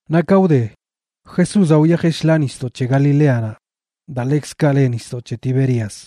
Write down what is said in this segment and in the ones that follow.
Naꞌ ka wde, Jesúzaꞌ wyajeꞌ shḻaa nisdoꞌ c̱he Galileanaꞌ, daa ḻekzkaꞌ le nisdoꞌ c̱he Tiberias.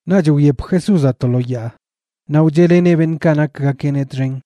Naꞌch wyep Jesúzaꞌ to lo yaa naꞌ wcheꞌleneꞌ beṉꞌkaꞌ nakgakeꞌneꞌ txen.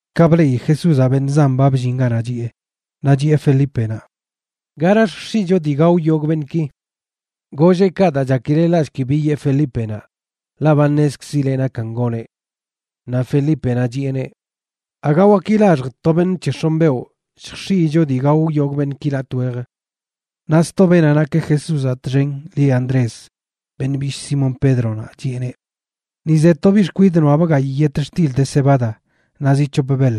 Ka bleꞌi Jesúzaꞌ beṉꞌ zan ba bllin ganaꞌ chiꞌe, naꞌ chiꞌe Felípenaꞌ: ―¿Gara lljx̱iꞌcho dii gao yogꞌ beṉꞌki? Golleꞌ kaꞌ daa chakileꞌ laꞌshki bi yee Felípenaꞌ, ḻaꞌ ba ṉezkzileꞌ nakan goneꞌ. Naꞌ Felípenaꞌ chiꞌeneꞌ: ―Aga waki laxj to beṉꞌ c̱he x̱onꞌ beoꞌ lljx̱iꞌyicho dii gao yogꞌ beṉꞌki latꞌ wej. Naꞌ sto beenaꞌ nak Jesúzaꞌ txen lieꞌ Andrés, beṉꞌ bishꞌ Simón Pédronaꞌ, chiꞌeneꞌ: ―Ni ze to biꞌ xkwidꞌ noꞌabꞌ gayꞌ yetxtil de cebada naꞌ zi c̱hop beḻ.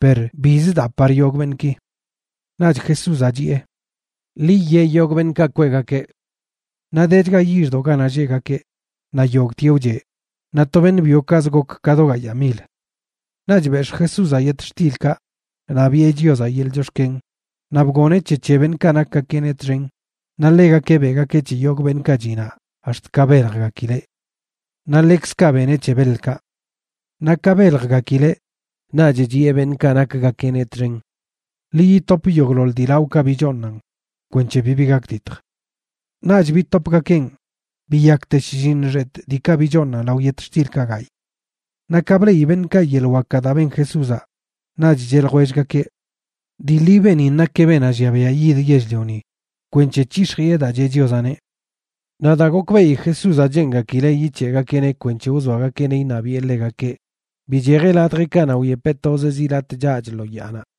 Per bizə daa par yogꞌ beṉꞌki. Naꞌch Jesúzaꞌ chiꞌe: ―Ḻi yee yogꞌ beṉꞌkaꞌ kweꞌgakeꞌ. Naꞌ dechga yixdoꞌ ganaꞌ lleꞌgakeꞌ, naꞌ yogꞌtieꞌ wcheꞌ, naꞌ to beṉꞌ byokaꞌzə gok ka do gayaa mil. Naꞌch bex̱ꞌ Jesúzaꞌ yetxtilkaꞌ, naꞌ biꞌe Chiozaꞌ yeḻꞌ chox̱ken, naꞌ bgoneꞌ c̱he c̱he beṉꞌkaꞌ nakgakeꞌneꞌ txen naꞌ ḻegakeꞌ beꞌgakeꞌ c̱he yogꞌ beṉꞌkaꞌ chiꞌ naꞌ ax̱t ka beljgakileꞌ. Naꞌ ḻekzkaꞌ beneꞌ c̱he beḻkaꞌ. Naꞌ ka beljgakileꞌ, naꞌch chiꞌe beṉꞌkaꞌ nakgakeꞌneꞌ txen: ―Ḻi yitop yogꞌḻoḻ dii laoꞌkaꞌ bichooṉan kwenc̱he bibi gakditj. Naꞌch bitopgakeꞌn, biyakte shlliṉ xetꞌ diikaꞌ bichooṉan lao yetxtilkaꞌ gayꞌ. Naꞌ ka bleꞌi beṉꞌkaꞌ yeḻꞌ wakaꞌ daa ben Jesúzaꞌ, naꞌch cheꞌ ljwellgakeꞌ: ―Dii ḻi beenin nakeꞌ beenaꞌ llia biaꞌ yid yell-lioni kwenc̱he c̱hix̱jiꞌe daa cheꞌ Chiozaꞌneꞌ. Naꞌ daa gokbeꞌi Jesúzaꞌ cheengakileꞌ yic̱heꞌgakeꞌneꞌ kwenc̱he wzoagakeꞌneꞌ iṉabiꞌe ḻegakeꞌ, bichejeꞌ ladjeꞌkaꞌ naꞌ wyepeꞌ tozeꞌ zi latꞌ chaꞌch lo yaanaꞌ.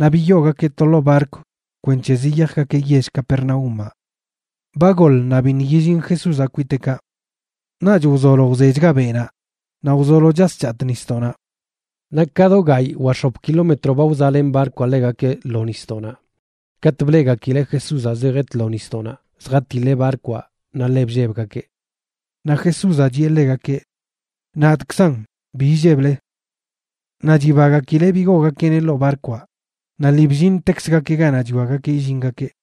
Naꞌ biyoogakeꞌ to ḻoo barkw kwenc̱he ziyajgakeꞌ yell Capernaúmaꞌ. Ba goḻ naꞌ biṉꞌ yillin Jesúzaꞌ kwiteꞌkaꞌ. Naꞌch wzolo wzechga beꞌnaꞌ naꞌ wzolo chas chatꞌ nisdoꞌnaꞌ. Naꞌ ka do gayꞌ wa x̱op kilómetro ba wzaꞌlen barkwaꞌ ḻegakeꞌ lo nisdoꞌnaꞌ katꞌ bleꞌgakileꞌ Jesúzaꞌ zejeꞌ tlo nisdoꞌnaꞌ zjatiḻeꞌ barkwaꞌ naꞌ ḻe bllebgakeꞌ. Naꞌ Jesúzaꞌ chiꞌe ḻegakeꞌ: ―Nadꞌkzan, ¡bi illeble! Naꞌ chibagakileꞌ bigoogakeꞌneꞌ ḻoo barkwaꞌ, naꞌ lii bllintekzgakeꞌ ganaꞌ chwiagakeꞌ illingakeꞌ.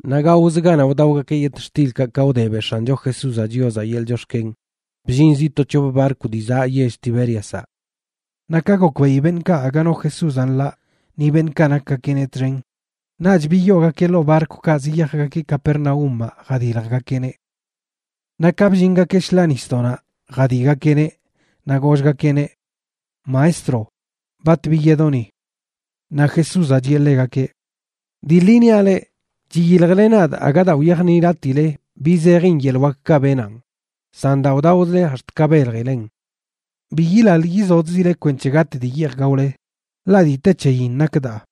Naꞌ gaozə ganaꞌ wdaogakeꞌ yetxtilkaꞌ ka wde beꞌ X̱ancho Jesúzaꞌ Chiozaꞌ yeḻꞌ chox̱ken, bllin sto c̱hop barkw dii zaꞌ yell Tibériazaꞌ. Naꞌ ka gokbeꞌi beṉꞌkaꞌ aga no Jesúzaꞌ nḻaꞌ ni beṉꞌkaꞌ nakgakeꞌneꞌ txen, naꞌch biyoogakeꞌ ḻoo barkwkaꞌ ziyajgakeꞌ Capernaúmaꞌ jadiljgakeꞌneꞌ. Naꞌ ka bllingakeꞌ shḻaa nisdoꞌnaꞌ jadiꞌgakeꞌneꞌ, naꞌ gollgakeꞌneꞌ: ―Maestro, ¿bat biyedoꞌ ni? Naꞌ Jesúzaꞌ chiꞌe ḻegakeꞌ: ―Dii ḻi niaꞌ leꞌ, chiyiljle nadꞌ aga daa wyajniꞌlatiꞌle bi zejin yeḻꞌ wakkaꞌ benanꞌ, san daa wdaozle ax̱t ka beljilen. Bi yilaḻ yizodzile kwenc̱he gatꞌ dii yeej gaole, ḻaꞌ dii te c̱heyin nak daa.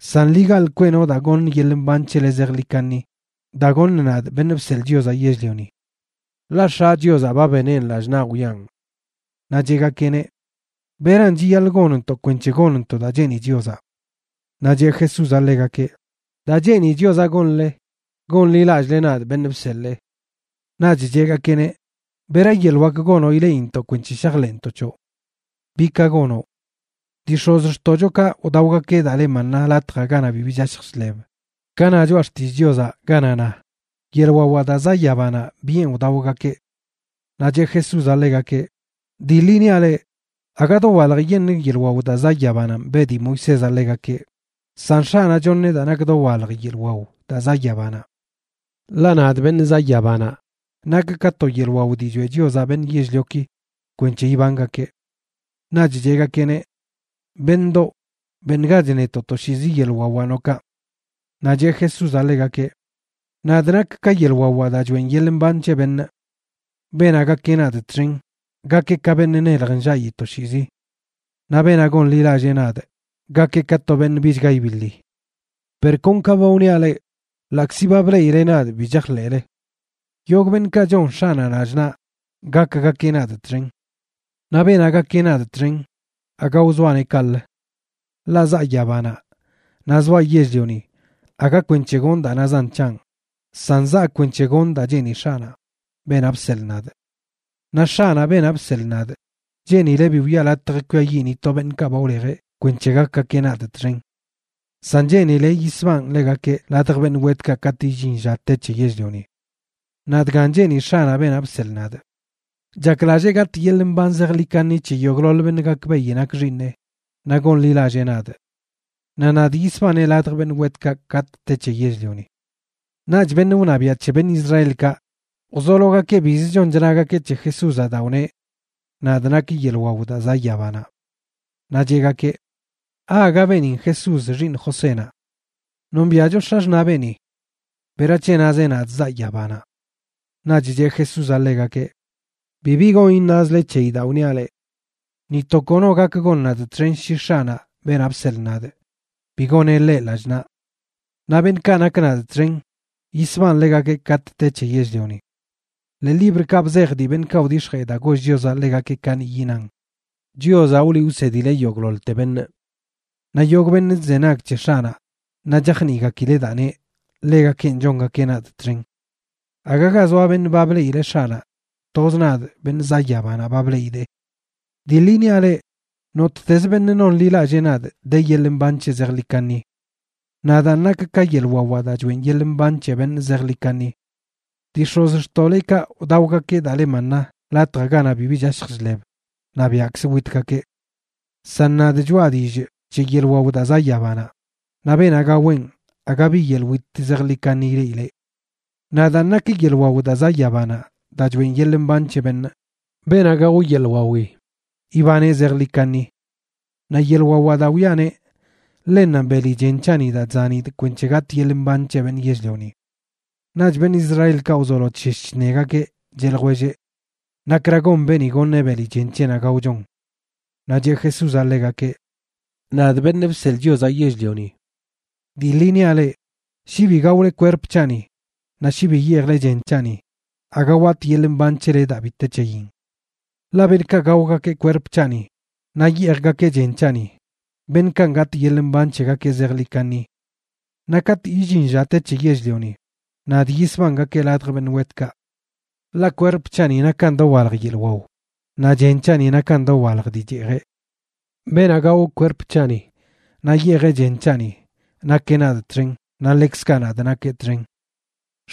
San ḻi gaḻꞌ kweꞌno daa goṉ yeḻꞌ mban c̱hele zejḻi kaṉi, daa goṉꞌ nadꞌ, Beṉꞌ Bseḻꞌ Chiozaꞌ Yell-lioni. Ḻaꞌ X̱aꞌ Chiozaꞌ ba beneꞌn lallꞌ naꞌ wiꞌan. Naꞌ cheꞌgakeꞌneꞌ: ―¿Beran chiyaḻꞌ gonntoꞌ kwenc̱he gonntoꞌ daa cheeni Chiozaꞌ? Naꞌ cheꞌ Jesúzaꞌ ḻegakeꞌ: ―Daa cheeni Chiozaꞌ gonle, gonḻilallꞌle nadꞌ, beṉꞌ bseḻee. Naꞌch cheꞌgakeꞌneꞌ: ―¿Bera yeḻꞌ wak gonoꞌ ileꞌintoꞌ kwenc̱he shajḻeꞌntoꞌ c̱hoꞌ? ¿Bi ka gonoꞌ? Dii x̱ozxtoꞌchokaꞌ wdaogakeꞌ daa le maná latjaꞌ ganaꞌ bibi chashj chḻeb, ka na Choꞌa Xtillꞌ Chiozaꞌ ganaꞌ na: “Yeḻꞌ wawaꞌ daa zaꞌ yabanaꞌ biꞌen wdaogakeꞌ.” Naꞌ cheꞌ Jesúzaꞌ ḻegakeꞌ: ―Dii ḻi niaꞌ leꞌ, aga dowaljyeṉꞌ yeḻꞌ wao daa zaꞌ yabananꞌ beꞌ dii Moisézaꞌ ḻegakeꞌ, san X̱aꞌnaꞌ choṉeꞌ daa nak dowalj yeḻꞌ wao daa zaꞌ yabanaꞌ. Ḻaꞌ nadꞌ, beṉꞌ zaꞌ yabanaꞌ, nakꞌ ka to yeḻꞌ wao dii choeꞌ Chiozaꞌ beṉꞌ yell-lioki kwenc̱he ibangakeꞌ. Naꞌch cheꞌgakeꞌneꞌ: ―Beṉꞌdoꞌ, beṉgach netoꞌ toshiizi yeḻꞌ wawaꞌ noꞌ kaꞌ. Naꞌ cheꞌ Jesúzaꞌ ḻegakeꞌ: ―Nadꞌ nakꞌ ka yeḻꞌ wawaꞌ daa choeꞌn yeḻꞌ mban c̱he beṉꞌ. Beenaꞌ gakeꞌ nadꞌ txen, gakeꞌ ka beṉꞌ nelj nllaꞌi toshiizi. Naꞌ beenaꞌ gonḻilallee nadꞌ, gakeꞌ ka to beṉꞌ bichga ibiḻi. Per kon ka ba wniaꞌ leꞌ, ḻaꞌkzi ba bleꞌile nadꞌ bi chajḻeꞌle. Yogꞌ beṉꞌkaꞌ chon X̱aꞌnaꞌ lallꞌ naꞌ, gakgakeꞌ nadꞌ txen. Naꞌ beenaꞌ gakeꞌ nadꞌ txen aga wzoaꞌneꞌ kaꞌlə. Ḻaꞌ zaa yabanaꞌ naꞌ zoaꞌ yell-lioni aga kwenc̱he gonꞌ daa nazan c̱hanꞌ, san zaa kwenc̱he gonꞌ daa cheeni X̱aꞌnaꞌ, beenaꞌ bseḻꞌ nadꞌ. Naꞌ X̱aꞌnaꞌ, beenaꞌ bseḻꞌ nadꞌ, cheenileꞌ bi wiꞌa latj kwiayiꞌ ni to beṉꞌkaꞌ ba wlejeꞌ kwenc̱he gakgakeꞌ nadꞌ txen. San cheenileꞌ yisbanꞌ ḻegakeꞌ ladj beṉꞌ wetkaꞌ katꞌ illin lla te c̱he yell-lioni. Naꞌ dgan cheeni X̱aꞌnaꞌ, beenaꞌ bseḻꞌ nadꞌ: chaklallee gatꞌ yeḻꞌ mban zejḻi kaṉi c̱he yogꞌḻoḻ beṉꞌ gakbeꞌi nakꞌ X̱iineꞌ naꞌ gonḻilallee nadꞌ. Naꞌ nadꞌ yisbanee ladj beṉꞌ wetkaꞌ katꞌ te c̱he yell-lioni. Naꞌch beṉꞌ wṉabiaꞌ c̱he beṉꞌ Israelkaꞌ wzologakeꞌ biz chon chnagakeꞌ c̱he Jesúzaꞌ daa wneꞌ: “Nadꞌ nakꞌ yeḻꞌ wao daa zaꞌ yabanaꞌ.” Naꞌ cheꞌgakeꞌ: ―¿Aaga beenin Jesús, xiiṉ Josénaꞌ? Nombiaꞌcho x̱axṉaꞌ beeni. ¿Berac̱he nazeꞌ: “nadꞌ zaꞌ yabanaꞌ”? Naꞌch cheꞌ Jesúzaꞌ ḻegakeꞌ: ―Bibi gon iṉazle c̱heyi daa wniaꞌ leꞌ. Ni to kono gak gon nadꞌ txen shi X̱aꞌnaꞌ, beenaꞌ bseḻꞌ nadꞌ, bi goneꞌ ḻeꞌ lallꞌ naꞌ. Naꞌ beṉꞌkaꞌ nak nadꞌ txen, yisbanꞌ ḻegakeꞌ katꞌ te c̱he yell-lioni. Ḻee librkaꞌ bzej dii beṉꞌkaꞌ wdix̱jee daa goll Chiozaꞌ ḻegakeꞌ kaniꞌyi nan: “Chiozaꞌ wliꞌ wsedileꞌ yogꞌḻoḻte beṉꞌ.” Naꞌ yogꞌ beṉꞌ chzenag c̱he X̱aꞌnaꞌ naꞌ chajniꞌgakileꞌ daa neꞌ, ḻegakenꞌ chongakeꞌ nadꞌ txen. ’Aga ga zoa beṉꞌ ba bleꞌileꞌ X̱aꞌnaꞌ; toz nadꞌ, beṉꞌ zaꞌ yabanaꞌ, ba bleꞌidee. Dii ḻi niaꞌ leꞌ, nottez beṉꞌ nonḻilallee nadꞌ de yeḻꞌ mban c̱heꞌ zejḻi kaṉi. Nadaan nakꞌ ka yeḻꞌ wawaꞌ daa choeꞌn yeḻꞌ mban c̱he beṉꞌ zejḻi kaṉi. Dii x̱ozxtoꞌlekaꞌ wdaogakeꞌ daa le maná latjaꞌ ganaꞌ bibi chashj chḻeb naꞌ biaꞌkzə witgakeꞌ. San nadꞌ choꞌa dillꞌ c̱he yeḻꞌ wao daa zaꞌ yabanaꞌ, naꞌ beenaꞌ gaweꞌn aga bi yeḻꞌ wit zejḻi kaṉi ileꞌileꞌ. Nadaan nakꞌ yeḻꞌ wao daa zaꞌ yabanaꞌ daa choꞌen yeḻꞌ mban c̱he beṉꞌ. Beenaꞌ gao yeḻꞌ wawi, ibaneꞌ zejḻi kaṉi. Naꞌ yelꞌ wawaꞌ daa wiꞌaneꞌ, ḻennanꞌ beli chen c̱haꞌni daa chzanidꞌ kwenc̱he gatꞌ yeḻꞌ mban c̱he beṉꞌ yell-lioni. Naꞌch beṉꞌ Israelkaꞌ wzolo chshesh chṉegakeꞌ, cheꞌ ljwelleꞌ: ―¿Nakra gon beeni goṉeꞌ beli chen c̱heꞌnaꞌ gaochon? Naꞌ cheꞌ Jesúzaꞌ ḻegakeꞌ: ―Nadꞌ, Beṉꞌ Bseḻꞌ Chiozaꞌ Yell-lioni, dii ḻi niaꞌ leꞌ, shi bi gaole kwerp c̱haꞌni naꞌ shi bi yeejle chen c̱haꞌni, aga watꞌ yeḻꞌ mban c̱hele daa bi te c̱heyin. Ḻaꞌ beṉꞌkaꞌ gaogakeꞌ kwerp c̱haꞌni naꞌ yeejgakeꞌ chen c̱haꞌni, beṉꞌkanꞌ gatꞌ yeḻꞌ mban c̱hegakeꞌ zejḻi kaṉi. Naꞌ katꞌ illin lla te c̱he yell-lioni, nadꞌ yisbangakee ladj beṉꞌ wetkaꞌ. Ḻaꞌ kwerp c̱haꞌni nakan dowalj yeḻꞌ wao, naꞌ chen c̱haꞌni nakan dowalj dii cheejeꞌ. Beenaꞌ gao kwerp c̱haꞌni naꞌ yeejeꞌ chen c̱haꞌni, nakeꞌ nadꞌ txen, naꞌ ḻekzkaꞌ nadꞌ nakee txen.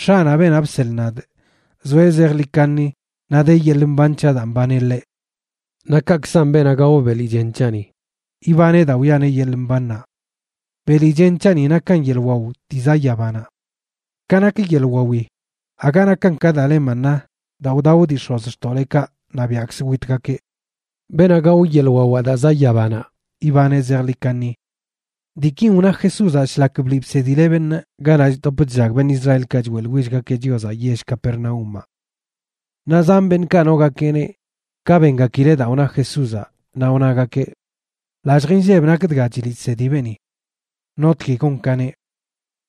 X̱aꞌnaꞌ, beenaꞌ bseḻꞌ nadꞌ, zoeꞌ zejḻi kaṉi naꞌ de yeḻꞌ mban c̱haꞌ daa mbaneꞌ ḻeꞌ. Naꞌ kaꞌkzan beenaꞌ gao beli chen c̱haꞌni ibaneꞌ daa wiꞌaneꞌ yeḻꞌ mbannaꞌ. Beli chen c̱haꞌni nakan yeḻꞌ waw dii zaꞌ yabanaꞌ. Ka nak yeḻꞌ wawi, aga nakan ka daa le maná daa wdao dii x̱ozxtoꞌlekaꞌ naꞌ biaꞌkzə witgakeꞌ. Beenaꞌ gao yeḻꞌ wawaꞌ daa zaꞌ yabanaꞌ, ibaneꞌ zejḻi kaṉi. Diikin wna Jesúzaꞌ shlak bliꞌ bsedileꞌ beṉꞌ ganaꞌ chdop chllag beṉꞌ Israelkaꞌ choeꞌḻwillgakeꞌ Chiozaꞌ yell Capernaúmaꞌ. Naꞌ zan beṉꞌkaꞌ nogakeꞌneꞌ, ka bengakileꞌ daa wna Jesúzaꞌ, naꞌ wnagakeꞌ: ―Lallj inlleb nak dga chliꞌ chsedi beeni. ¿Notgui gon ka neꞌ?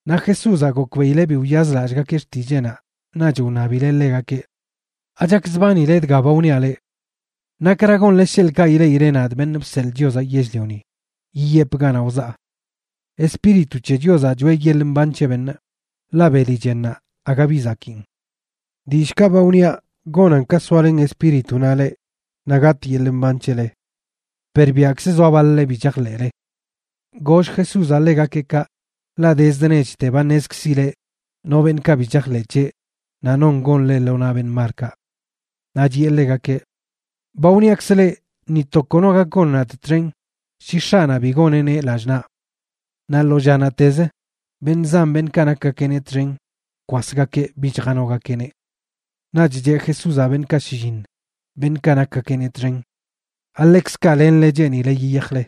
Naꞌ Jesúzaꞌ gokbeꞌileꞌ bi wyazlallꞌgakeꞌ xtilleeꞌnaꞌ, naꞌch wṉabileꞌ ḻegakeꞌ: ―¿Achakzbanile dga ba wniaꞌ leꞌ? ¿Nakra gonle sheḻꞌkaꞌ ileꞌile nadꞌ, Beṉꞌ Bseḻꞌ Chiozaꞌ Yell-lioni, yiyepꞌ ganaꞌ wzaa? Espíritu c̱he Chiozaꞌ choꞌe yeḻꞌ mban c̱he beṉꞌ, ḻaꞌ beli chennaꞌ aga bi zakiin. Dillꞌkaꞌ ba wniaꞌ gonan ka soalen Espíritunaꞌ leꞌ naꞌ gatꞌ yeḻꞌ mban c̱hele. Per biaꞌkzə zoa baḻ-le bi chajḻeꞌle. Goll Jesúzaꞌ ḻegakeꞌ kaꞌ, ḻaꞌ dezd nechte ba ṉezkzileꞌ no beṉꞌkaꞌ bi chajḻeꞌ c̱heꞌ naꞌ non gon ḻeꞌ lo naꞌ beṉꞌ malkaꞌ. Naꞌ chiꞌe ḻegakeꞌ: ―Ba wniakzꞌ leꞌ ni to kono gak gon nadꞌ txen shi X̱aꞌnaꞌ bi goneꞌneꞌ lallꞌ naꞌ. Naꞌ lo llanaꞌtez beṉꞌ zan beṉꞌkaꞌ nakgakeꞌneꞌ txen bkwasgakeꞌ bich janogakeꞌneꞌ. Naꞌch cheꞌ Jesúzaꞌ beṉꞌkaꞌ shlliṉ, beṉꞌkaꞌ nakgakeꞌneꞌ txen: ―¿Aḻekzkaꞌ lenle cheenile yiyajle?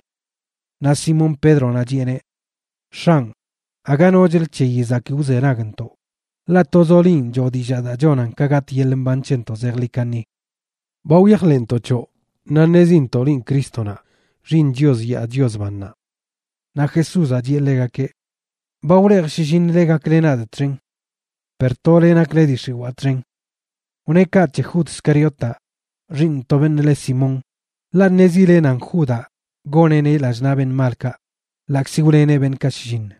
Naꞌ Simón Pédronaꞌ chiꞌeneꞌ: ―X̱anꞌ, aga nochlə c̱heyi zakii wzenagntoꞌ, ḻaꞌ tozoꞌ linꞌ choo dillaa daa chonan ka gatꞌ yeḻꞌ mban c̱hentoꞌ zejḻi kaṉi. Ba wyajḻeꞌntoꞌ c̱hoꞌ, naꞌ ṉezintoꞌ linꞌ Crístonaꞌ, Xiiṉ Chios yaa Chios bannaꞌ. Naꞌ Jesúzaꞌ chiꞌe ḻegakeꞌ: ―Ba wlejꞌ shlliṉle gakle nadꞌ txen. Per tole nakle dii x̱iwaa txen. Wneꞌ kaꞌ c̱he Jud Scariotaꞌ, xiiṉ to beṉꞌ le Simón, ḻaꞌ ṉezileꞌ nan Judaꞌ goneꞌneꞌ lallꞌ naꞌ beṉꞌ malkaꞌ, ḻaꞌkzi wleneꞌ beṉꞌkaꞌ shlliṉ.